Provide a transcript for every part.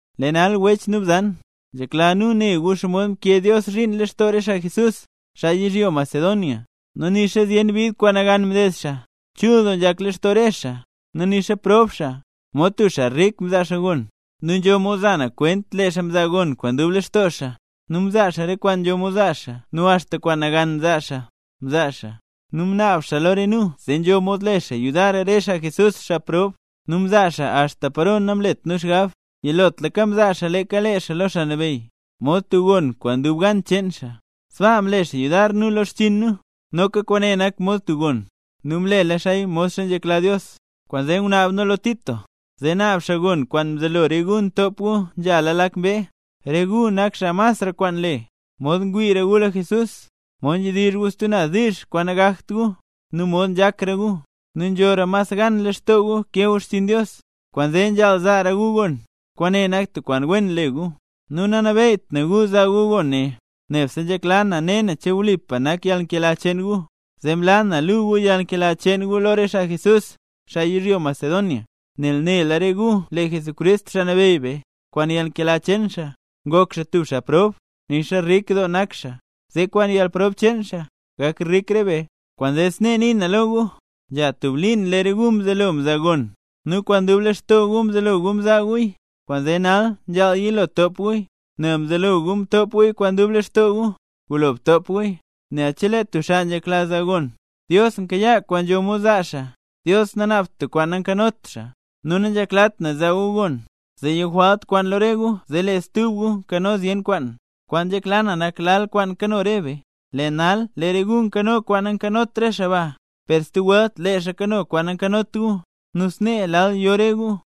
Lee nal wech nu bzan, nzhekla nu ne gu xomod mkee Dios zhiin lextoo re xaa Jesús, xaa yizhyo Macedonia. Nu nixa zyen bid kwaan nagan mded xaa, chul doo nzhak lextoo re xaa; nu nixa prob xaa, mod tub xaa rik mzaa xaa gon. Nu nzho mod za na kwent lee xaa mzaa gon kwaan dub lextoo xaa, nu mzaa xaa re kwaan nzho mod zaa xaa nu axta kwaan nagan zaa xaa, mzaa xaa. Nu mnaab xaa lo re nu zee nzho mod le xaa yudar re xaa mle nambey Jesús, xaa prob. Nu mzaa xaa axta paro namlet nu xgab, yilotlaka mzaa xaa leeka lee xaa lo Xaa Nabeyy, mod tub gon kwaan dub gan cheen xaa, sbaa mle xaa yudar nu lo xchiin nu, noka kwaane nak mod tub gon, nu mlela xaaya modxa nzhekla Dios. Kwaanzee ngunaab nu lo Tito, zee naab xaa gon kwaan mzelo re gu ntop gu nzhala lak mbee. Re gu nak xaa masra kwaan nle: mod ngwiira gu lo Jesús, mod nzhedizhra gu stub naz diizh kwaan nagakt gu, nu mod nzhakra gu, nu nzhora mas gan lextoo gu kee gu xchiin Dios. Kwaanzee nzhaal zaara gu gon, kwaane nak tub kwaan wen le gu. Nu nanabeyyt na gu zaa gu gon ne, nebse nzhekla na ne na che wlipa nak yalnkela cheen gu, zee mlaa na luu gu yalnkela cheen gu lo re xaa Jesús, xaa yizhyo Macedonia. Nel nela re gu lee Jesucrist, Xaa Nabeyy be, kwaan yalnkela cheen xaa, ngok xaa tub xaa prob, nixa rik doo nak xaa, zee kwaan yalprob cheen xaa, gak rik re be. Kwaanzee snee nii na lo gu. Nzha tub liin lee re gu mzelo mzaa gon; nu kwaan dub lextoo gu mzelo gu mzaa guya, kwaanzee nal nzhaal yilo top guya. Nel mzelola gu mtop guya kwaan dub lextoo gu, gulo btop guya. Nel chelee tub xaa nzhekla zaa gon, Dios nkayaa kwaan nzho mod zaa xaa. Dios nanaabt tub kwaan nankanot xaa. Nu nanzheklat na zaa gu gon, zee yo jwalt kwaan lo re gu zee lee stub gu nkano zyen kwaan; kwaan nzhekla na nak lal kwaan kano re be. Lee nal lee re gu nkano kwaan nankanot re xaa ba, per stub welt lee xaa kano kwaan nankanot gu, nu snee lal yo re gu.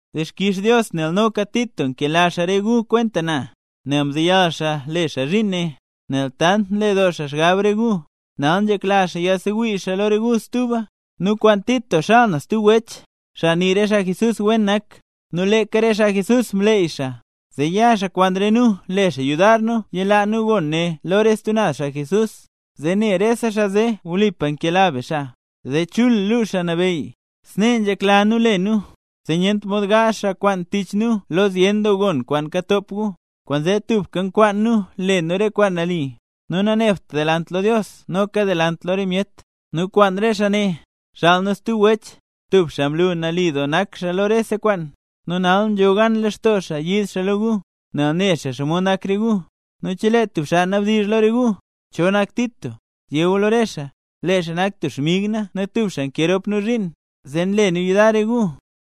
Dixkix Dios nel noka Tito nkela xaa re gu kwenta na. Nel mzeyal xaa le xaa zhiin ne, nel tant nle doo xaa xgab re gu, nal nzhekla xaa yaadsewii xaa lo re gu stuba. Nu kwaan Tito xaal na stub wech, xaa nii re xaa Jesús wen nak. Nu leeka re xaa Jesús mleey xaa, zee ya xaa kwaan re nu le xaa yudar nu yilaa nu gon ne lo re stub naz xaa Jesús, zee ne rese xaa zee wlipa nkela be xaa, zee chul luu Xaa Nabeyy. Snee nzhekla nu le nu, zee nyent mod gaazh xaa kwaan tich nu lo zyen doo gon kwaan katop gu. Kwaanzee tubka nkwaan nu le nu re kwaan nali, nu nanebt delant lo Dios noka delant lo re myet. Nu kwaan re xaa ne, xaal nu stub wech, tub xaa mlu nali doo nak xaa lo rese kwaan; nu nal nzho gan lextoo xaa yiid xaa lo gu, nel ne xaa xomod nak re gu. Nu chelee tub xaa nabdizh lo re gu, cho nak Tito, yé gu lo re xaa, lee xaa nak tub xmig na nu tubka nkee rop nu zhiin, zee nle nu yudar re gu.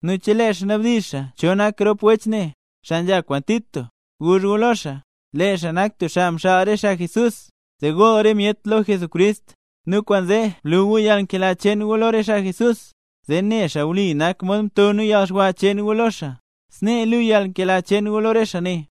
Nu chelee xaa nabdizh xaa cho nak rop wech ne, xaa nzha kwaan Tito, guzh gu lo xaa, lee xaa nak tub xaa mxaal re xaa Jesús, zee gool re myet lo Jesucrist. Nu kwaanzee blu gu yalnkela cheen gu lo re xaa Jesús, zee ne xaa wli nak mod mto nu yalxwa cheen gu lo xaa; snee luu yalnkela cheen gu lo re xaa ne.